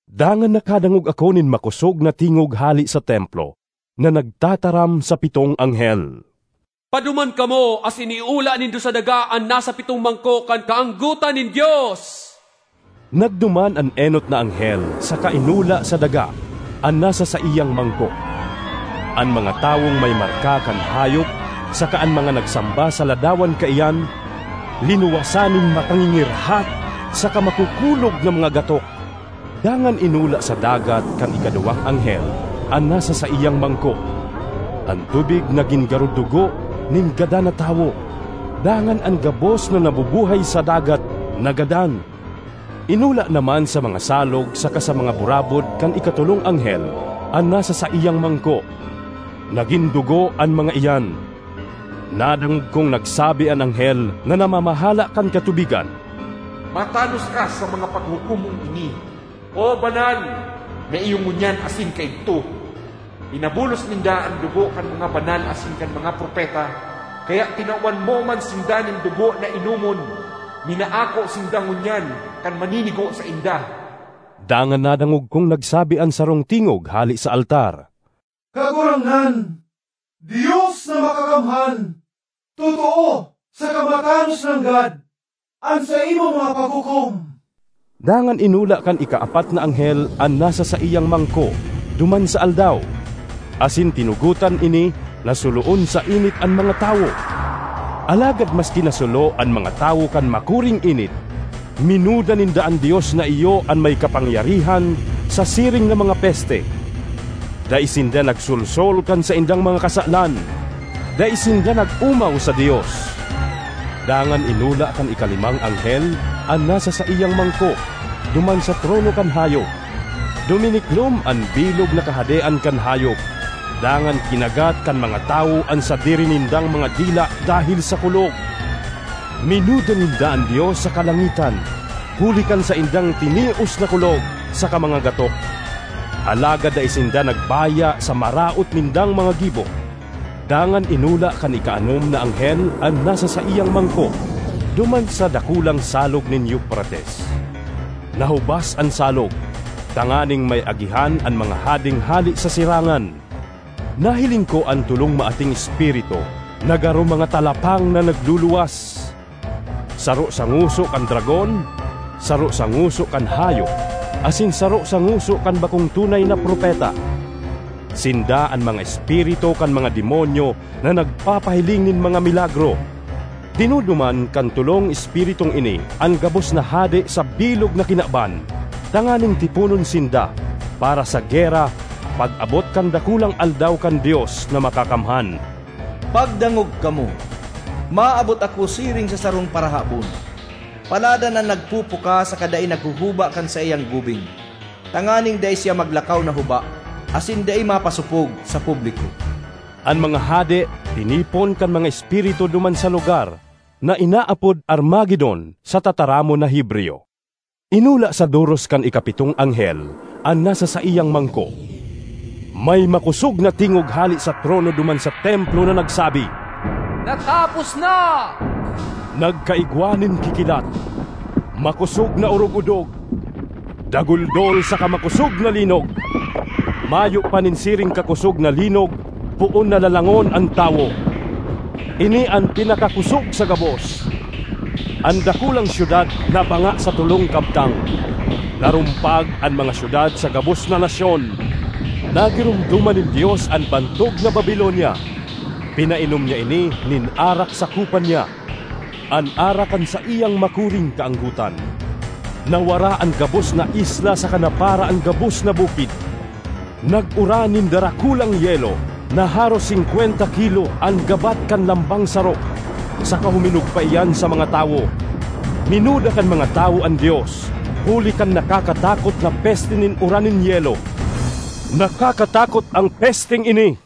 Dangan nakadangog ako nin makosog na tingog hale sa templo na nagtataram sa pitong anghel, “Paduman kamo asin iula nindo sa daga an nasa pitong mangko kan kaanggotan nin Dios!” Nagduman an enot na anghel saka inula sa daga an nasa saiyang mangko. An mga tawong may marka kan hayop saka an mga nagsamba sa ladawan kaiyan, linuwasan nin makangingirhat saka makukulog na mga gatok. Dangan inula sa dagat kan ikaduwang anghel an nasa saiyang mangko. An tubig nagin garo dugo nin gadan na tawo, dangan an gabos na nabubuhay sa dagat nagadan. Inula naman sa mga salog saka sa mga burabod kan ikatolong anghel an nasa saiyang mangko; nagin dugo an mga iyan. Nadangog kong nagsabi an anghel na namamahala kan katubigan, “Matanos ka sa mga paghukom mong ini, O Banal, na iyo ngunyan asin kaidto! Pinabulos ninda an dugo kan mga banal asin kan mga propeta, kaya tinawan mo man sinda nin dugo na inomon. Minaako sinda ngunyan kan maninigo sainda!” Dangan nadangog kong nagsabi an sarong tingog hale sa altar, “Kagurangnan, Dios na Makakamhan, totoo saka matanos nanggad an saimong mga paghukom!” Dangan inula kan ikaapat na anghel an nasa saiyang mangko duman sa aldaw, asin tinugotan ini na suloon sa init an mga tawo. Alagad maski nasulo an mga tawo kan makuring init, minuda ninda an Dios na iyo an may kapangyarihan sa siring na mga peste; dai sinda nagsolsol kan saindang mga kasalan, dai sinda nag-omaw sa Dios. Dangan inula kan ikalimang anghel an nasa saiyang mangko duman sa trono kan hayop. Duminiklom an bilog na kahadean kan hayop, dangan kinagat kan mga tawo an sadiri nindang mga dila dahel sa kulog. Minuda ninda an Dios sa kalangitan huli kan saindang tinios na kulog saka mga gatok; alagad dai sinda nagbaya sa maraot nindang mga gibo. Dangan inula kan ikaanom na anghel an nasa saiyang mangko duman sa dakulang Salog nin Eufrates. Nahubas an salog, tanganing may agihan an mga hadeng hale sa sirangan. Nahiling ko an tolong maating espiritu na garo mga talapang na nagluluwas: saro sa ngoso kan dragon, saro sa ngoso kan hayop, asin saro sa ngoso kan bakong tunay na propeta. Sinda an mga espiritu kan mga demonyo na nagpapahiling nin mga milagro. Dinuduman kan tolong espiritung ini an gabos na hade sa bilog na kinaban tanganing tiponon sinda para sa gera pag-abot kan dakulang Aldaw kan Dios na Makakamhan. ”Pagdangog kamo! Maabot ako siring sa sarong parahabon! Paladan an nagpupuka saka dai naghuhuba kan saiyang gubing, tanganing dai siya maglakaw na huba asin dai mapasopog sa publiko!” An mga hade tinipon kan mga espiritu duman sa lugar na inaapod Armagedon sa tataramon na Hebreyo. Inula sa doros kan ikapitong anghel an nasa saiyang mangko. May makosog na tingog hale sa trono duman sa templo na nagsabi, “Natapos na!” Nagkaigwa nin kikilat, makosog na urogudog, daguldol saka makosog na linog. Mayo pa nin siring kakosog na linog poon na lalangon an tawo; ini an pinakakosog sa gabos! An dakulang syudad nabanga sa tolong kabtang; narumpag an mga syudad sa gabos na nasyon. Nagiromdoman nin Dios an bantog na Babilonia; pinainom niya ini nin arak sa kopa niya—an arak kan saiyang makuring kaanggotan. Nawara an gabos na isla saka napara an gabos na bukid. Nag-uran nin darakulang yelo na haros singkwenta kilo an gabat kan lambang saro, saka huminugpa iyan sa mga tawo. Minuda kan mga tawo an Dios huli kan nakakatakot na peste nin uran nin yelo. Nakakatakot an pesteng ini!